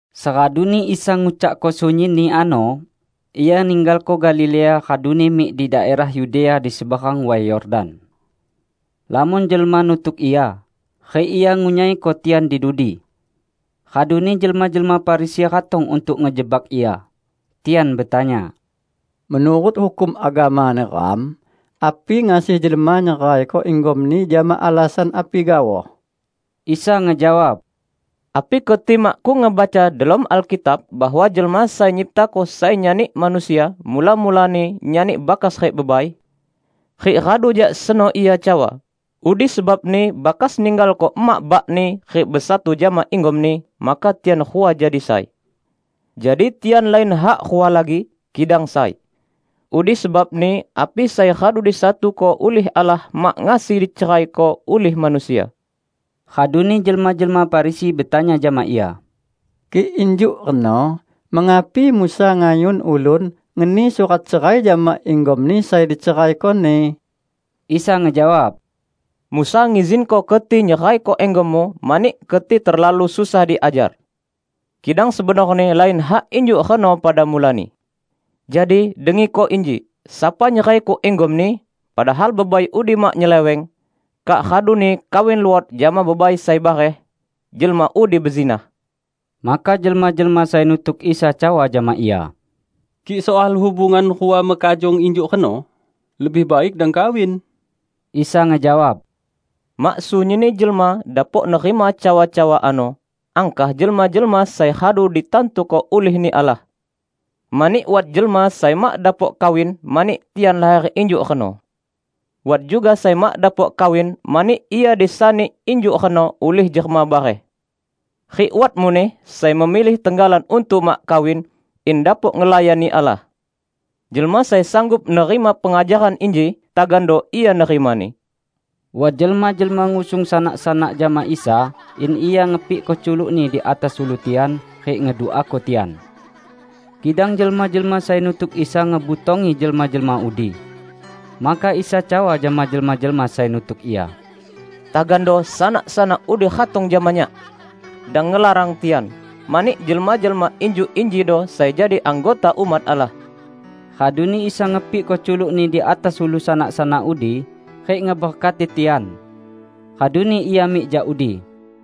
Seraduni Isa ngucakko sunyinni ano, Ia ninggalko Galilea raduni mik di daerah Yudea di seberang Way Yordan. Lamon jelma nutuk Ia, rik Ia ngunyaiko tian di dudi. Raduni jelma-jelma Farisi ratong untuk ngejebak Ia. Tian betanya, "Menurut hukum agama neram, api ngasi jelma nyeraiko inggomni jama alasan api gaoh?" Isa ngejawab, "Api keti makkung ngebaca delom Alkitab bahwa Jelma Sai Nyiptako sai nyani manusia, mula-mulani nyani bakas rik bebai? Rik radu jak seno Ia cawa, 'Udi sebabni bakas ninggalko emak bakni rik besatu jama inggomni, maka tian rua jadi sai.' Jadi tian lain hak rua lagi, kidang sai. Udi sebabni api sai radu disatuko ulih Allah mak ngasi diceraiko ulih manusia." Raduni jelma-jelma Farisi betanya jama Ia, "Kik injuk reno mengapi Musa ngayun ulun ngeni surat cerai jama inggomni sai diceraikoni?" Isa ngejawab, "Musa ngizinko keti nyeraiko inggommu mani keti terlalu susah diajar. Kidang sebenorni lain hak injuk reno pada mulani. Jadi, dengiko inji: Sapa nyeraiko inggomni -- padahal bebai udi mak nyeleweng -- kak raduni kawin luot jama bebai sai bareh, jelma udi bezinah." Maka jelma-jelma sai nutuk Isa cawa jama Ia, "Kik soal hubungan rua mekajong injuk reno, lebih baik dang kawin." Isa ngejawab, "Mak sunyinni jelma dapok nerima cawa-cawa ano, angkah jelma-jelma sai radu ditantuko ulih-Ni Allah. Mani wat jelma sai mak dapok kawin, mani tian laher injuk reno. Wat juga sai mak dapok kawin mani ia disani injuk reno ulih jelma bareh. Rik wat muneh sai memilih tenggalan untuk mak kawin, in dapok ngelayani Allah. Jelma sai sanggup nerima pengajaran inji, tagando ia nerimani." Wat jelma-jelma ngusung sanak-sanak jama Isa in Ia ngepikko culuk-Ni di atas ulu tian rik ngeduako tian. Kidang jelma-jelma sai nutuk Isa ngebutongi jelma-jelma udi. Maka Isa cawa jama jelma-jelma sai nutuk Ia, "Tagando sanak-sanak udi ratong jama Nyak! Dang ngelarang tian, mani jelma-jelma injuk injido sai jadi anggota umat Allah." Raduni Isa ngepikko culuk-Ni di atas ulu sanak-sanak udi rik ngeberkati tian. Raduni Ia mik jak udi.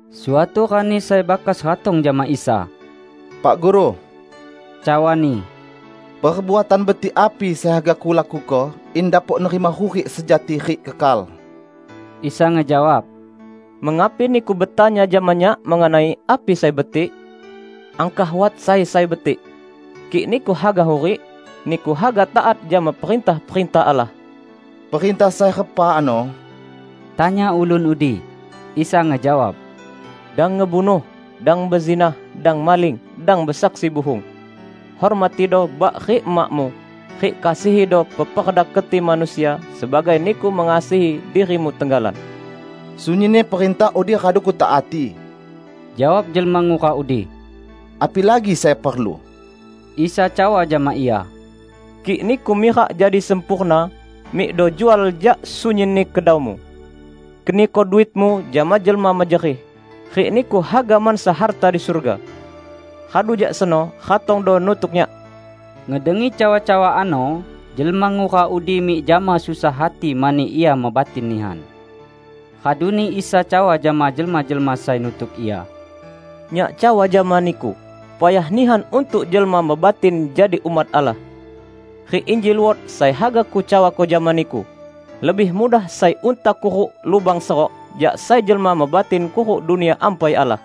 Suatu rani sai bakas ratong jama Isa, "Pak Guru," cawani, "perbuatan betik api sai haga kulakuko in dapok nerima hurik sejati rik kekal?" Isa ngejawab, "Mengapi niku betanya jama Nyak mengenai api sai betik? Angkah wat Sai sai betik. Kik niku haga hurik, niku haga taat jama perintah-perintah Allah." "Perintah sai repa ano?" tanya ulun udi. Isa ngejawab, "Dang ngebunuh, dang bezinah, dang maling, dang besaksi buhung, hormatido bak rik emakmu; rik kasihido peperda keti manusia sebagai niku mengasihi dirimu tenggalan." "Sunyinni perintah udi radu kutaati," jawab jelma ngura udi. "Apilagi sai perlu?" Isa cawa jama ia, "Kik niku mirak jadi sempurna, mikdo jual jak sunyinni kedaumu. Keniko duitmu jama jelma mejerih, rik niku haga mansa harta di surga. Radu jak seno, ratongdo nutuk Nyak!" Ngedengi cawa-cawa ano, jelma ngura udi mik jama susah hati mani ia mebatin nihan. Raduni Isa cawa jama jelma-jelma sai nutuk Ia, "Nyak cawa jama niku, payah nihan untuk jelma mebatin jadi umat Allah. Rik inji luot sai haga Kucawako jama niku; lebih mudah sai unta kuruk lubang serok, jak sai jelma mebatin kuruk Dunia Ampai Allah."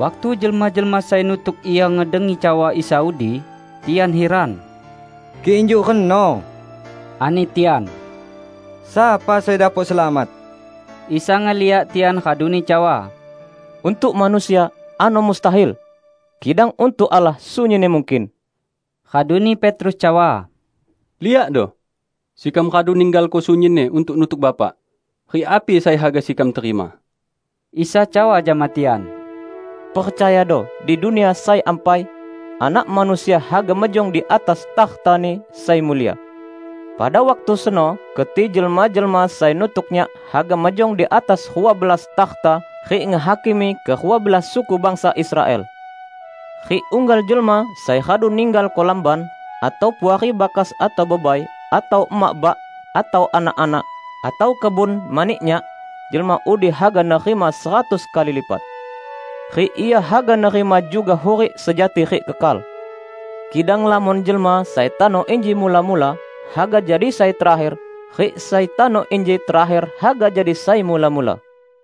Waktu jelma-jelma sai nutuk Ia ngedengi cawa Isa udi, tian hiran. "Kik injuk reno," ani tian, "sapa sai dapok selamat?" Isa ngeliak tian raduni cawa, "Untuk manusia, ano mustahil! Kidang untuk Allah, sunyinni mungkin." Raduni Petrus cawa, "Liakdo, sekam radu ninggalko sunyinni untuk nutuk Bapak. Rik api sai haga sekam terima?" Isa cawa jama tian, "Percayado: Di Dunia sai Ampai, Anak Manusia haga mejong di atas takhta-Ni sai mulia. Pada waktu seno keti jelma-jelma sai nutuk Nyak haga mejong di atas rua belas takhta rik ngehakimi kerua belas suku bangsa Israel! Rik unggal jelma sai radu ninggalko lamban, atau puari bakas atau bebai, atau emak bak, atau anak-anak, atau kebun mani Nyak, jelma udi haga nerima seratus kali lipat. Rik ia haga nerima juga hurik sejati rik kekal. Kidang lamon jelma sai tano inji mula-mula haga jadi sai terakher rik sai tano inji terakher haga jadi sai mula-mula."